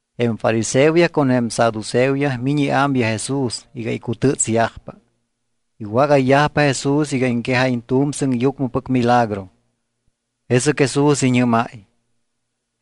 Jém fariseoyaj con jém saduceoyaj miñ iámyaj Jesús iga icutɨ́tsyajpa. Iwágayyajpa Jesús iga iŋquejáyiñ tu̱m sɨŋyucmɨpɨc milagro. Jesɨc Jesús iñɨ́máy: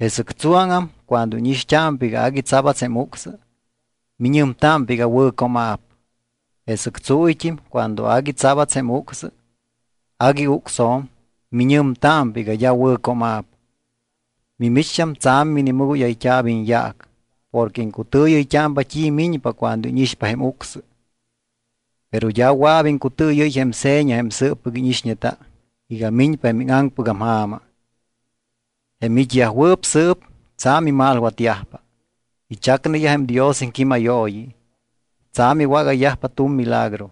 —Jesɨc tsuáŋam cuando íñixt́ámpa iga agui tsabats jém ucsɨ, miñɨmtámpa iga wɨ̱cooma̱p. Jesɨc tsuuyt́im cuando agui tsabats jém ucsɨ, agui ucsjo̱m, miñɨmtámpa iga d́a wɨ̱cooma̱p. Mimicht́am tsa̱m minimɨgóyayt́a̱p iñyaac porque iŋcutɨɨyɨyt́ámpa t́i miñpa cuando íñixpa jém ucsɨ, pero d́a wɨa̱p iŋcutɨɨyɨ́y jém seña jém sɨɨppɨc íñixñeta iga miñpa jém íŋaŋpɨgam ja̱ma. Jém it́yajwɨɨp sɨɨp tsa̱m imalwatyajpa, ichacneyaj jém Dios iŋquímayooyi, tsa̱m iwágayyajpa tu̱m milagro.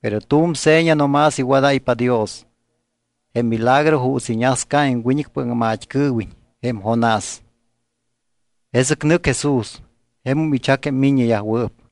Pero tu̱m seña no más iwadáypa Dios, jém milagro juuts iñasca jém wiñɨcpɨc aŋmat́cɨɨwiñ jém Jonás. Jesɨc nɨc Jesús. Jemum ichac jém miññeyajwɨɨp.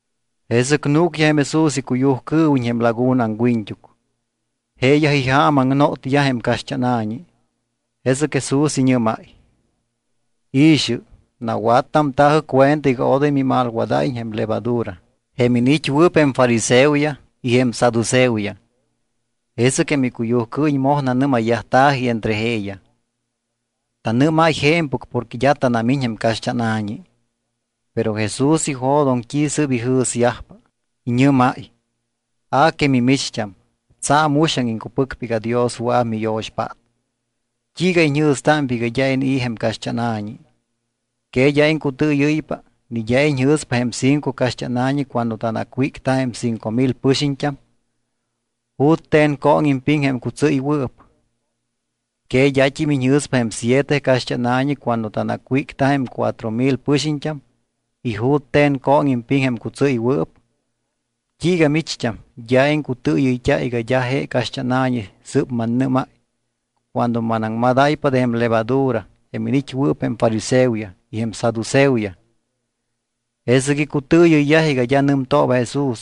Jesɨc núcyaj jém Jesús icuyujcɨɨwiñ jém laguna aŋwiñt́uc. Jeeyaj ijaamaŋnotyaj jém caxt́ána̱ñi. Jesɨc Jesús iñɨ́máy: —I̱xɨ, nawattamta̱jɨ cuenta iga odoy mimalwadáyiñ jém levadura jém iniit́wɨɨp jém fariseoyaj y jém saduceoyaj. Jesɨc jém icuyujcɨɨwiñ moj nanɨ́mayyajta̱ji entre jeeyaj: —Tanɨ́máy je̱mpɨc porque d́a tanamiñ jém caxt́ána̱ñi. Pero Jesús ijo̱doŋ t́i sɨ́p ijɨ̱syajpa, iñɨ́máy: —A que mimicht́am, tsa̱m uxaŋ iŋcupɨcpa iga Dios wɨa̱p miyo̱xpát. ¿T́iiga iñjɨ̱stámpa iga d́a inii̱ jém caxt́ána̱ñi? ¿Que d́a iŋcutɨɨyɨ́ypa, ni d́a iñjɨ̱spa jém cinco caxt́ána̱ñi cuando tanacwícta jém cinco mil pɨxiñt́am? ¿Jute̱n cooŋ impiŋ jém cutsɨ́ywɨɨp? ¿Que d́at́im iñjɨ̱spa jém siete caxt́ána̱ñi cuando tanacwícta jém cuatro mil pɨxiñt́am y jute̱n cooŋ impiŋ jém cutsɨ́ywɨɨp? ¿T́iiga micht́am d́a iŋcutɨɨyɨyt́a iga d́a je caxt́ána̱ñi sɨ́p mannɨ́máy cuando manaŋmadáypa de jém levadura jém iniit́wɨɨp jém fariseoyaj y jém saduceoyaj? Jesɨc icutɨɨyɨyyaj iga d́a nɨmtooba Jesús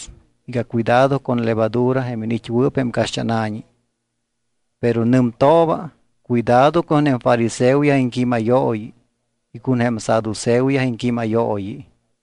iga cuidado con levadura jém iniit́wɨɨp jém caxt́ána̱ñi, pero nɨmtooba cuidado con jém fariseoyaj iŋquímayooyi y con jém saduceoyaj iŋquímayooyi.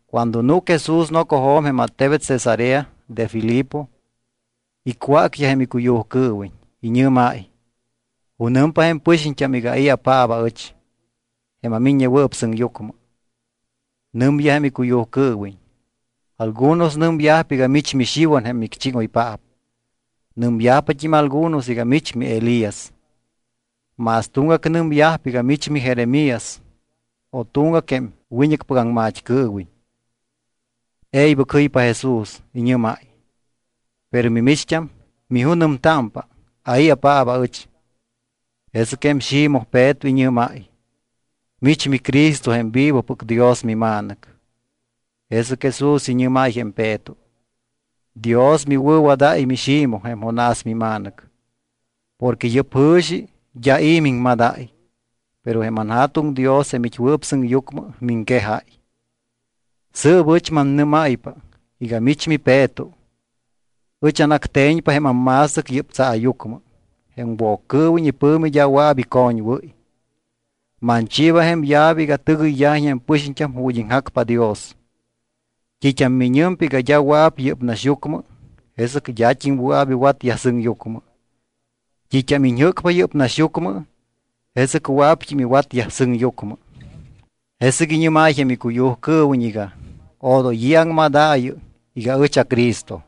Cuando núc Jesús nocojo̱m jém attebet Cesarea de Filipo, icwácyaj jém icuyujcɨɨwiñ, iñɨ́máy: —¿Junɨmpa jém pɨxiñt́am iga ai̱apaap aɨch, jém aMiññewɨɨp Sɨŋyucmɨ? Nɨmyaj jém icuyujcɨɨwiñ: —Algunos nɨmyajpa iga mich miXiwan jém micchíŋoypaap. Nɨmyajpat́im algunos iga mich miElías. Más tuŋgac nɨmyajpa iga mich miJeremías o tuŋgac jém wiñɨcpɨc aŋmat́cɨɨwiñ. E̱ybɨc jɨypa Jesús, iñɨ́máy: —Pero mimicht́am, ¿mijunɨmtámpa, ai̱apaap aɨch? Jesɨc jém Ximoj Peto iñɨ́máy: —Mich miCristo jém vivopɨc Dios miMa̱nɨc. Jesɨc Jesús iñɨ́máy jém Peto: —Dios miwɨ̱wadáy miXimoj jém Jonás mima̱nɨc, porque yɨ́p jɨ̱xi d́a i̱ miŋmadáy, pero jém anJa̱tuŋ Dios jém it́wɨɨp sɨŋyucmɨ miŋquejáy. Sɨɨp ɨch mannɨ́máypa iga mich miPeto. Ɨch anacte̱ñpa jém amma̱stɨc yɨ́p tsaayucmɨ. Jém Woccɨɨwiñ ipɨ̱mi d́a wɨa̱p icoñwɨ́y. Manchiiba jém llave iga tɨgɨyyajiñ jém pɨxiñt́am ju̱t́ iŋjacpa Dios. T́it́am miñɨmpa iga d́a wɨa̱p yɨ́p naxyucmɨ, jesɨc d́at́im wɨa̱p iwatyaj sɨŋyucmɨ. T́it́am iñjɨ́cpa yɨ́p naxyucmɨ, jesɨc wɨa̱pt́im iwatyaj sɨŋyucmɨ. Jesɨc iñɨ́máy jém icuyujcɨɨwiñ iga: “Odoy i̱ aŋmadaayɨ iga ɨch aCristo.”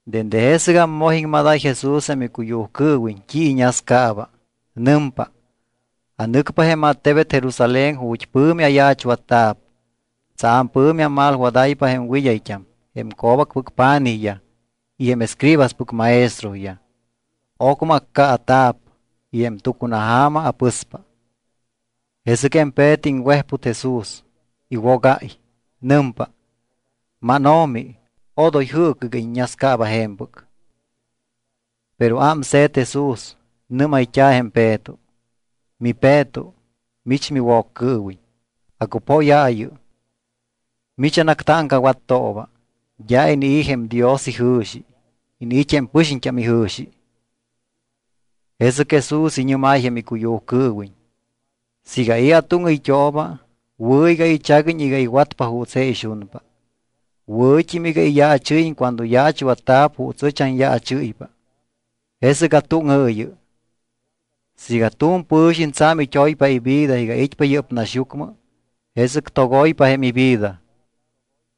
Dende jesɨgam moj iŋmadáy Jesús jém icuyujcɨɨwiñ t́i iñascaaba. Nɨmpa: —Anɨcpa jém attebet Jerusalén ju̱t́ pɨ̱mi ayaachwatta̱p. Tsa̱m pɨ̱mi amalwadáypa jém wɨd́ayt́am, jém co̱bacpɨc pa̱nijyaj, y jém escribaspɨc maestroyaj. Ocmɨ accaata̱p y jém tucunaja̱ma apɨspa. Jesɨc jém Peto iŋwejput Jesús, iwogáy. Nɨmpa: —MánO̱mi, odoy jɨɨcɨ iga iññascaaba je̱mpɨc. Pero ámse̱t Jesús, nɨ́mayt́a̱ jém Peto: —MiPeto, mich miwoccɨɨwiñ, acupóyaayɨ. Mich anactáŋcawattooba. D́a inii̱ jém Dios ijɨ̱xi. Iniit́ jém pɨxiñt́am ijɨ̱xi. Jesɨc Jesús iñɨ́máy jém icuyujcɨɨwiñ: —Siiga i̱ atúŋɨyt́ooba, wɨ̱ iga ichaguiñ iga iwatpa juuts je ixunpa, wɨ̱t́im iga iyaachɨ́yiñ cuando yaachwatta̱p juuts ɨch anyaachɨ́ypa, jesɨc atúŋɨɨyɨ. Siiga tu̱m pɨ̱xiñ tsa̱m it́oypa ivida iga it́pa yɨ́p naxyucmɨ, jesɨc togoypa jém ivida.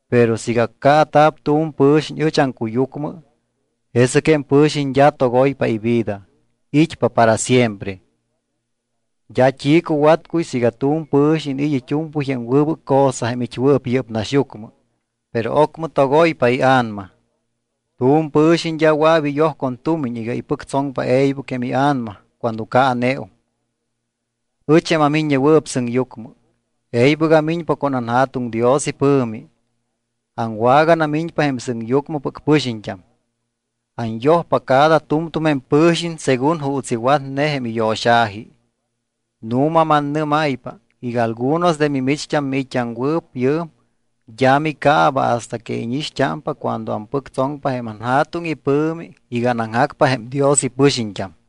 Pero siiga accaata̱p tu̱m pɨ̱xiñ ɨch aŋcuyucmɨ, jesɨc jém pɨ̱xiñ d́a togoypa ivida, it́pa para siempre. D́a t́i cuwatcuy siiga tu̱m pɨ̱xiñ iniit́ it́u̱mpɨy jém wɨbɨc cosa jém it́wɨɨp yɨ́p naxyucmɨ, pero ocmɨ togoypa ia̱nama. Tu̱m pɨ̱xiñ d́a wɨa̱p iyoj con tumiñ iga ipɨctsoŋpa e̱ybɨc jém ia̱nama cuando caaneum. Ɨch, jém aMiññewɨɨp Sɨŋyucmɨ, e̱ybɨc amiñpa con anJa̱tuŋ Dios ipɨ̱mi. Aŋwaganamiñpa jém sɨŋyucmɨpɨc pɨxiñt́am. Anyojpa cada tu̱mtu̱m jém pɨ̱xiñ según juuts iwatne jém iyo̱xa̱ji. Nu̱ma, mannɨ́máypa iga algunos de mimicht́am miit́t́aŋwɨɨp yɨɨm d́a micaaba hasta que íñixt́ámpa cuando ampɨctsoŋpa jém anJa̱tuŋ ipɨ̱mi iga anaŋjacpa jém Dios ipɨxiñt́am.